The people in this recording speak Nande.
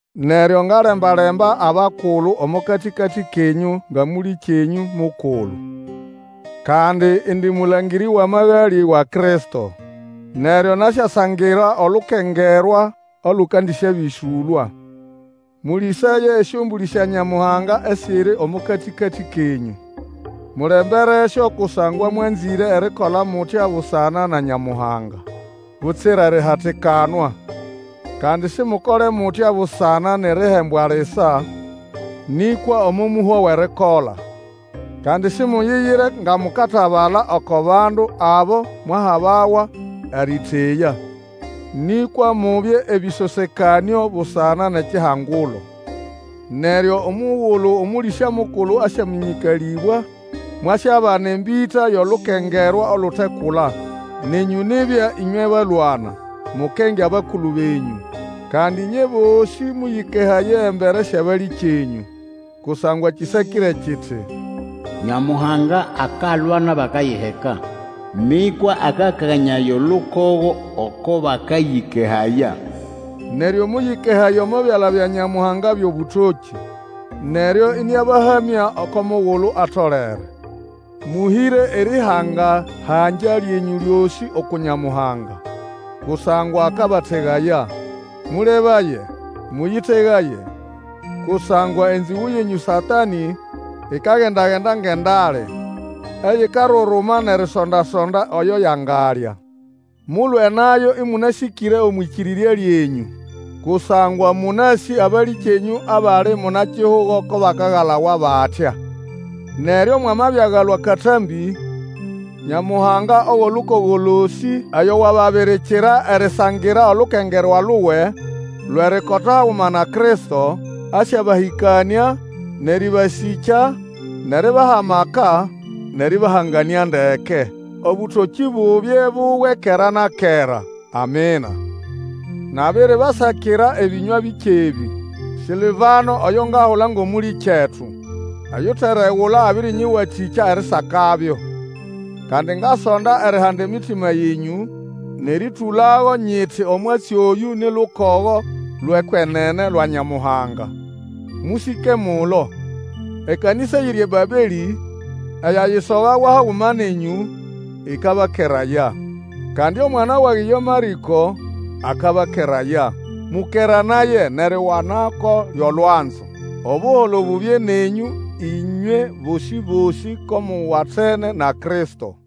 Neryo, ngalemba-lemba abakulu omo katĩkatĩ kenyũ nga mũlĩkyenyũ mukulu. Kandi indi mũlangĩrĩ wʼamagalĩ wa Kristo. Neryo nasyasangira olukengerwa olũkandĩsyabĩsũlwa. Mũlĩsaye esyombũlĩ sya Nyamuhanga esiri omo katĩkatĩ kenyũ. Mulemberesyo kusangwa mwanzĩre erikola mutya busana na Nyamuhanga, butsira erihatikanwa. Kandi Simukole mutya busana nʼerihembwa lisa, nĩkwa omo mũhwa wʼerikola. Kandi simuyiyire nga mukatabala oko bandu abo mwahabawa erĩteya, nĩkwa mubye ebĩsosekanĩo busana nʼekihangulo. Neryo mugulu Omũlĩsya mukulu asyamĩnyĩkalĩbwa, mwasyabana embĩta yʼolukengerwa olutekula. Nenyũ nibya ĩnywe balwana, mukenge abakulu benyũ. Kandi ĩnywe bosĩ mũyĩkehaye embere syʼabalĩkyenyũ, kusangwa kĩsakĩre kiti, Nyamuhanga akalwa nʼabakayiheka, Nĩkwa akakanyaya olukogo oko bakayĩkehaya. Neryo mũyĩkehaye omo byala bya Nyamuhanga byʼobũtokĩ, neryo ĩnĩabahamya oko mugulu atolere. Mũhĩre erĩhangahangya lyenyũ lyosĩ uku Nyamuhanga, kusangwa akabategaya. Mũlebaye, mũyĩtegaye! Kusangwa enzĩgũ yenyũ Satanĩ, ikagenda-genda ngʼendale, eyikaruruma nʼerisonda-sonda oyo yangalya. Mulwe nayo ĩmũnasĩkĩre omwʼĩkĩrĩrya lyenyũ, kusangwa mũnasĩ abalĩkyenyũ abali muna-kihugo ko bakagalawa batya. Neryo mwamabiagalwa akatambĩ, Nyamuhanga owʼolukogo losĩ oyo wababirikira erisangira olukengerwa luwe lwʼerikota haguma na Kristo, asyabahĩkanĩa, nʼerĩbasĩkya, nʼeribaha amaka, nʼerĩbahanganĩa ndeke. Obũtokĩ bubye buwe kera na kera. Amina. Nabiribasakira ebĩnywa bike ebĩ. Sĩlvano oyo ngahula ngʼomũlĩkyetu oyuteregula abĩrĩnyĩwatĩkya erisakabyo. Kandi ngasonda erihanda emitima yenyũ nʼerĩtũlago nyiti omwatsi oyũ ni lukogo lwʼekwenene lwa Nyamuhanga. Mũsĩke mulo. Ekanĩsa eyiri eBabelĩ, eyayisogawa haguma nenyũ, ĩkabakeraya. Kandi omwana wage ye Marĩko akabakeraya. Mũkeranaye nʼeriwanako lyʼolwanzo. Obuholo bubye nenyũ ĩnywe bosĩ-bosĩ ko muwatene na Kristo.